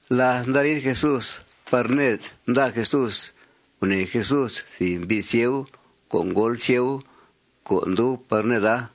Láth nda riid Jesús par ned nda Jesús, gunèe Jesús thìb mbi' sieu co' ngóol sieu co' ndub par neda.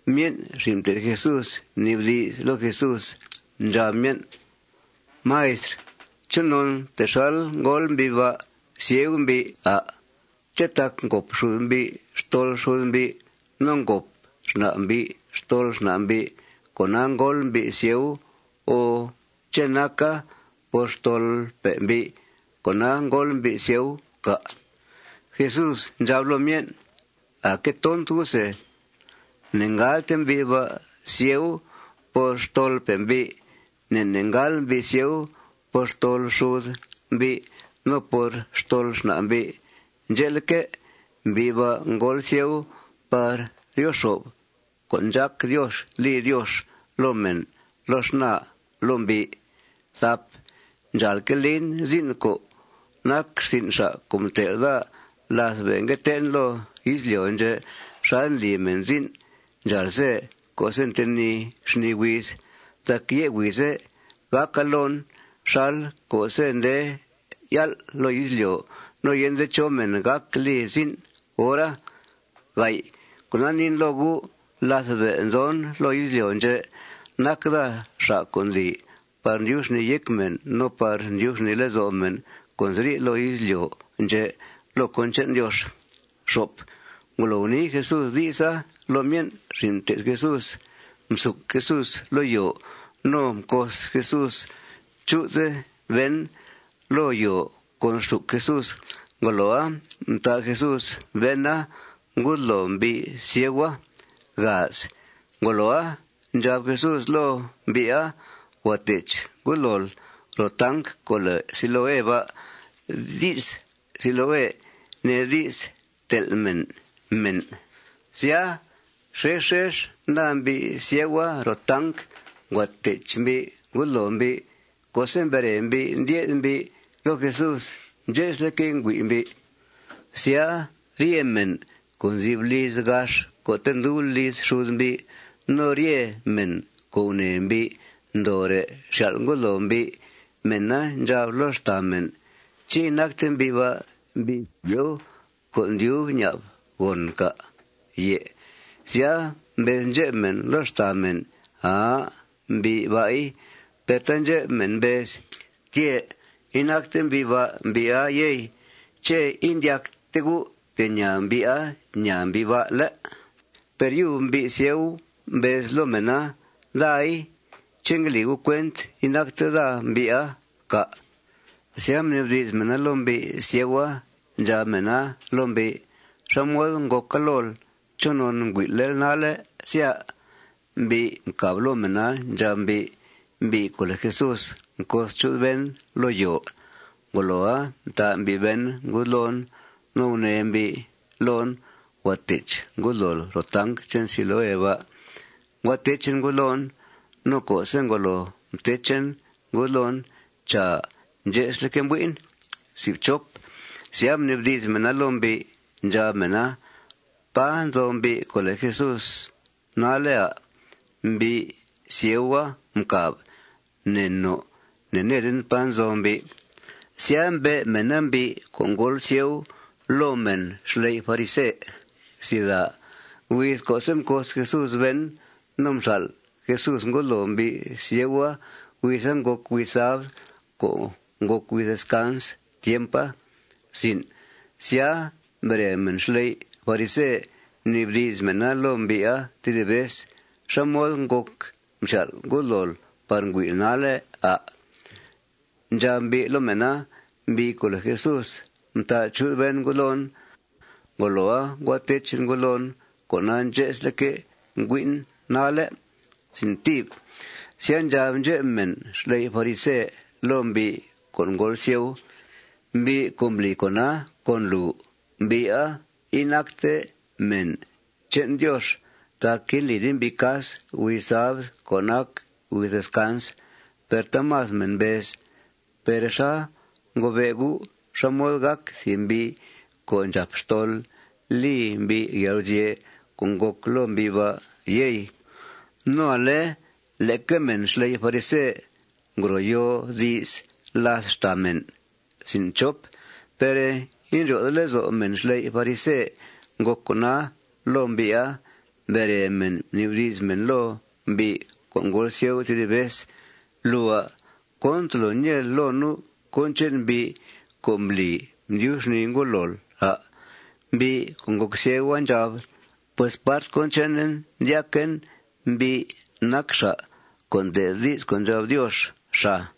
Myen' xin' mté'th Jesús mnibdi's loo Jesús. Ndxab myen': ―Maistr, ¿chonon texal ngóol mbi' ba' sieu mbi', à'? ¿Ché' tac ngòp xud mbi' xtol xud mbi' no ngòp xna' mbi' xtol xna' mbi' cona ngóol mbi' sieu o ché' naca por xtolpe' mbi', cona ngóol mbi' sieu, cà'? Jesús ndxab loo myen': ―Aa que tont gu' se. Ne'ngáalte mbi' ba' sieu por xtolpe' mbi'. Ne' ne' ngáal mbi' sieu por xtol xud mbi' no por xtol xna' mbi'. Ndxe'leque', mbi' ba' ngóol sieu par ryo xo'f con' ndxác Diox li Diox loo mèn loo xnaa loo mbi'. Ndxàalque' lin zin' co' nac rsin' xa' co' mtel' daa láth be' ngue tee'en loo izlyo' ndxè' xal ndli mèn zin' ndxáal ze co'se' ntenìi xnìi huiz. Tac yé' huize' gàca loon xal co'se' nde yál' loo izlyo' no yende chó mèn gác li zin' hora. Cona, niin loo gu': Láth be' nzon loo izlyo' ndxè' nac daa xa' co' ndli par ndyub xnìi yéc mèn no par ndyub xnìi lezo' mèn co' nziri' loo izlyo' ndxè' loo cón che'n Diox. Ngolo gunii Jesús di'sa loo myen' xin' mté'th Jesús, msuc Jesús loo yòo. No mcos Jesús chu'th ben loo yòo con rsuc Jesús. Ngoloa, mtà Jesús bena ngudloo mbi' sieua. Ngoloa, ndxab Jesús loo mbi'a: ―Huàa tech ngudlool ro tanc co' lèe Siloé ba'. Di's Siloé nee di's ntel' mèn mèn. Sya, xex xex nda mbi' sieua ro tanc. Ngua tech mbi' ngudloo mbi'. Co'se' mbere mbi', ndye'th mbi' loo Jesús, ndxe'sleque' ngüi' mbi'. Sya, rye mèn co' nzi'f liz gax co'te' ndub liz xud mbi' no rye mèn co' gunèe mbi' ndoore' xyal' ngudloo mbi', mèna ndxab loo xtàa mèn: ―¿Ché' inacte mbi' ba' mbi' sieu co' ndyub ña'b gòn, cà'? Sya, mbez ndxep mèn loo xtàa mèn: ―Aa. Mbi' ba'i. Per taandxep mèn mbez: ―Tyè'. Inacte mbi' ba' mbi'a, yey. ¿Ché' indyacte gu' te' ñaa mbi'a ñaa mbi' ba', ¿lé'? Per yub mbi' sieu mbez loo mèna: ―Daaai. ¿Ché' ngue li gu' cuent inacte daa mbi'a, cà'? Sya, mnibdi's mèna loo mbi' sieua. Ndxab mèna loo mbi': ―¿Xá mod ngòca lool? ¿Chonon ngüi'lel nalle', sya? Mbi' mcàb loo mèna. Ndxab mbi': ―Mbi' co' lèe Jesús mcos chu'th ben loo yòo. Ngoloa, mtà mbi' ben ngudloon. No gunee mbi' loon: Huàa tech ngudlool ro tanc che'n Siloé ba'. Ngua techen ngudloon. No co'se' ngolo mtechen ngudloon, chàa, ndxe'sleque' mbui'en. Sya, mnibdi's mèna loo mbi'. Ndxab mèna: ―¿Pá nzo mbi' co' lèe Jesús nalle', à'? Mbi' sieua mcàb: ―Ne no. Ne'needen pá nzo mbi'. Sya, mbe' mèna mbi' co' ngóol sieua loo mèn xley' farise. Huiz co'se' mcos Jesús ben no mxal' Jesús ngudloo mbi' sieua, huiza ngòc huiz sabd co' ngòc huiz descans tiempa. Sya, mbere mèn xley' farise, mnibdi's mèna loo mbi'a tedib vez: ―¿Xá mod ngòc mxyal' ngudlool par ngüi'l nalle', à'? Ndxab mbi' loo mèna: ―Mbi' co' lèe Jesús mtà chu'th ben ngudloon. Ngoloa, ngua techen ngudloon. Cona, ndxe'selque' ngüi'en nalle'. Sya, ndxab ndxep mèn xley' farisea loo mbi' co' ngóol sieu: ―Mbi' co' mbli con'a con lùu, mbi'a inacte mèn che'n Diox tac indlide mbi' cas huiz sabd co' nac huiz descans. Per taamas mèn mbez: ―Per ¿xá ngobe' gu' xá mod gác thìb mbi' co' ndxàp xtol li mbi' yalguzye' co' ngòc loo mbi' ba', yey? No ale leque mèn xley' farise ngro yoo di's làth xtàa mèn. Per indryo'de lezo' mèn xley' farise ngòc con'a loo mbi'a. Mbere mèn, mnibdi's mèn loo mbi' co' ngóol sieu tedib vez: ―Lùua, ¿cón tolo ñeel loo nu' cón che'n mbi' co' mbli mdyub xnìi ngudlool, à'? Mbi' co' ngòc sieu ndxab: ―Pues part cón chenen, ndyaquen mbi' nac xa' co' nde'th di's co' ndxab Diox, xàa.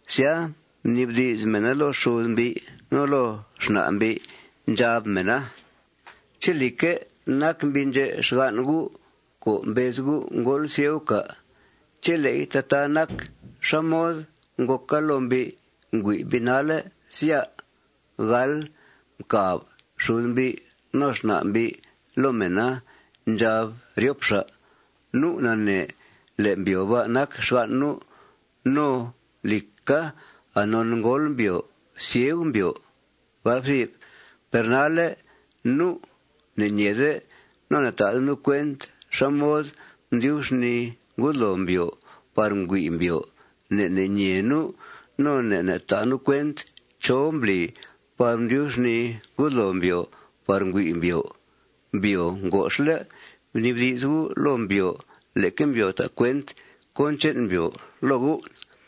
Sya, mnibdi's mèna loo xud mbi' no loo xna' mbi'. Ndxab mèna: ―¿Ché', lìcque', nac mbi' ndxè' xgan' gu' co' mbez gu' ngóol sieu, cà'? Chele'i tataa nac, ¿xá mod ngòca loo mbi' ngüi' mbi nalle', sya? Mcàb xud mbi' no xna' mbi' loo mèna. Ndxab ryop xa': ―Nu' nanee le' mbyòo ba' nac xgan' nu'. No, lìca, anon ngóol mbyòo sieu mbyòo. Per nalle' nu' ne'ñeede no ne'ta'de nu' cuent xá mod mdyub xnìi ngudloo mbyòo par ngüi' mbyòo. Ne' ne' ñee nu' no ne' ne' ta' nu' cuent chó mbli par mdyub xnìi ngudloo mbyòo par ngüi' mbyòo. Mbyòo ngoxle'. Bnibdi's gu' loo mbyòo. Leque mbyòo ta' cuent cón che'n mbyòo loo gu'.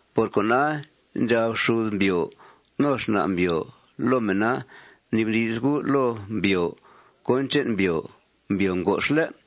Por cona, ndxab xud mbyòo no xna' mbyòo loo mèna: Bnibdi's gu' loo mbyòo cón che'n mbyòo. Mbyòo ngoxle'.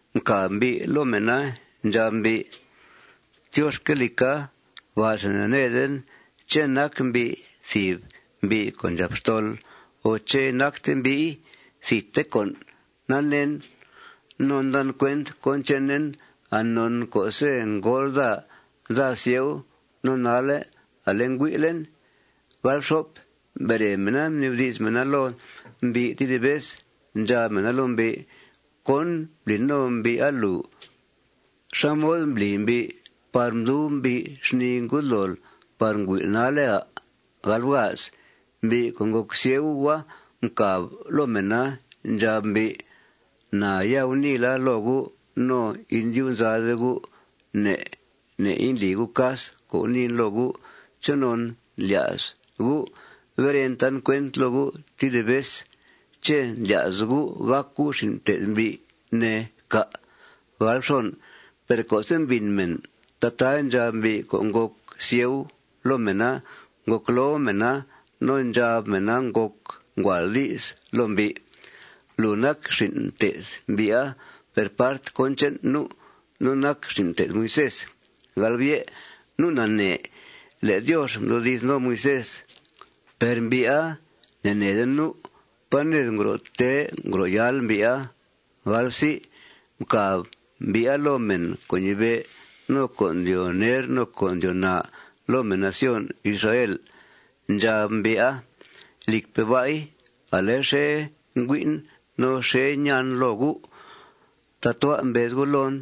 Mcàb mbi' loo mèna. Ndxab mbi': ―Tyoxca, lìca; ba'se ne'needen ché' nac mbi' thìb mbi' co' ndxàp xtol, o ché' inacte mbi'i. Thidte con' naneen. No ndan cuent cón chenen anon co'se' ngóol daa, daa sieu. No nalle' ale ngüi'len. Mbere mèna, mnibdi's mèna loo mbi' tedib vez. Ndxab mèna loo mbi': ―¿Cón mbli no mbi'a lùu? ¿Xá mod mbli mbi' par mdub mbi' xnìi ngudlool par ngüi'l nalle', à'? Mbi' co' ngòc sieua mcàb loo mèna. Ndxab mbi': ―Na ya guniila loo gu' no indyub nzade gu' ne' ne' indli gu' cas co' guniin loo gu'. ¿Chonon lya's gu' beren tan cuent loo gu' tedib vez? ¿Ché' ndlya's gu' gàc gu' xin' mté'th mbi', ne, cà'? Per co'se' mbìn mèn tataa ndxab mbi' co' ngòc sieu loo mèna, ngocloo mèna no ndxab mèna ngòc nguàal di's loo mbi': ―Lùu nac xin' mté'th mbi'a. Per part cón che'n nu', nu' nac xin' mté'th Moisés. Nu' nanee le' Diox mdoodi's no Moisés. Per mbi'a, ne'neede nu' pá ned ngro' tee ngro' yáal mbi'a. Mcàb mbi'a loo mèn co' ñibe', no co' ndyoo ner, no co' ndyoo naa loo mèn nación Israel. Ndxab mbi'a: ―Lìcpe' ba'i, ale xèe ngüi'en no xèe ñaan loo gu' tatua' mbez gu' loon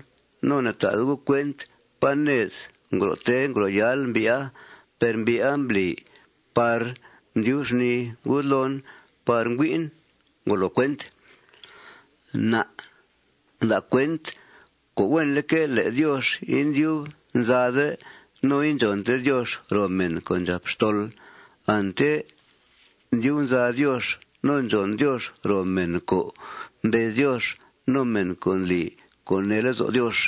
no ne'ta'de gu' cuent pá ned ngro' tee ngro' yáal mbi'a. Per mbi'a mbli par mdyub xnìi ngudloon par ngüi'en. Ngolo cuent. Na' nda' cuent co' huenleque' le' Diox indyub nzade no indxònte Diox ro mèn co' ndxàp xtol. Ante ndyub nza Diox no ndxòn Diox ro mèn co' mbez Diox no mèn co' ndli co' nee lezo' Diox.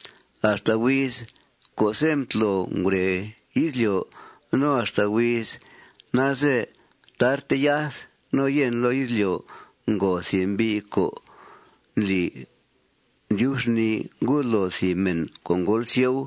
Axta huiz co'se' mtlo ngure izlyo' no axta huiz nalze tarte yath no yèn loo izlyo' ngo thìb mbi' co' ndli ndyub xnìi ngudloo thìb mèn co' ngóol sieu.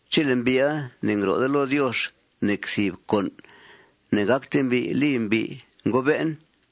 Chele' mbi'a ne'ngro'de loo Diox nec thìb con' ne'gácte mbi' li mbi', ngobe'en.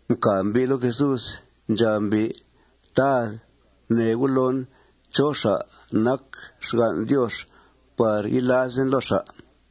Mcàb mbi' loo Jesús. Ndxab mbi': ―Tad, gunee U' loon chó xa' nac xgan' Diox par yilazen loo xa'.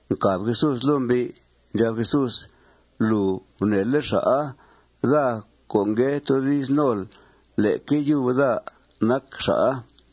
Mcàb Jesús loo mbi'. Ndxab Jesús: ―Lùu gunèele' xa'a. Daa co' ngue toodi's nol, leque yub daa nac xa'a.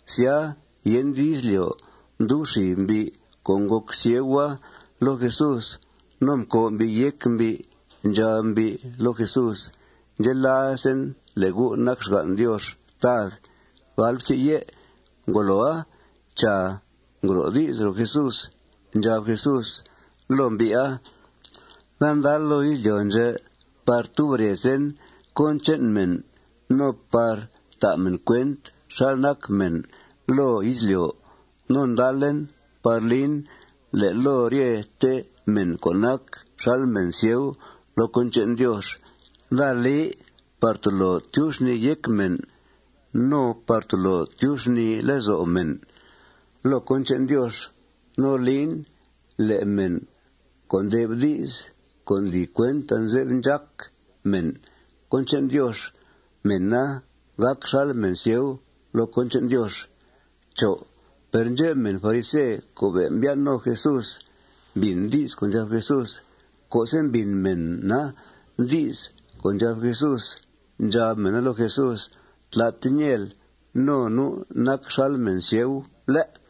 Sya, yende izlyo' mdub xib mbi' co' ngòc sieua loo Jesús. No mcòo' mbi' yéc mbi'. Ndxab mbi' loo Jesús: ―Ndxelazen le' U' nac xgan' Diox, Tad. Ngoloa, chàa, ngro' di's ro Jesús. Ndxab Jesús loo mbi'a: ―Daa ndal loo izlyo' ndxè' par tub rezen cón che'n mèn no par ta' mèn cuent xal nac mèn loo izlyo'. No ndalen par lin le' loo ryete mèn co' nac xal mèn sieu loo cón che'n Diox, daa li par tolo tyub xnìi yéc mèn no par tolo tyub xnìi lezo' mèn loo cón che'n Diox. No lin le' mèn co' nde'f di's co' ndli cuent anze'f ndxác mèn cón che'n Diox, mèna gàc xal mèn sieu loo cón che'n Diox. Per ndxep mèn farise co' be' mbyan' con Jesús mbìn di's co' ndxab Jesús. Co'se' mbìn mèna di's co' ndxab Jesús, ndxab mèna loo Jesús: ―Tlate ñeel no nu' nac xal mèn sieu, ¿lé'?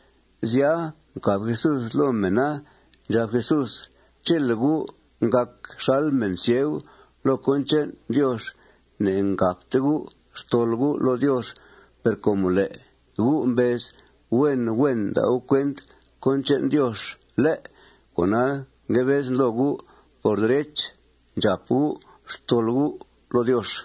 Sya, mcàb Jesús loo mèna. Ndxab Jesús: ―Chele' gu' ngàc xal mèn sieu loo cón che'n Diox, ne'ngàpte gu' xtol gu' loo Diox. Per com le' gu' mbez huen huen nda' gu' cuent cón che'n Diox, ¿lé'?, cona, ngue bezen loo gu', por derech, ndxàp gu' xtol gu' loo Diox.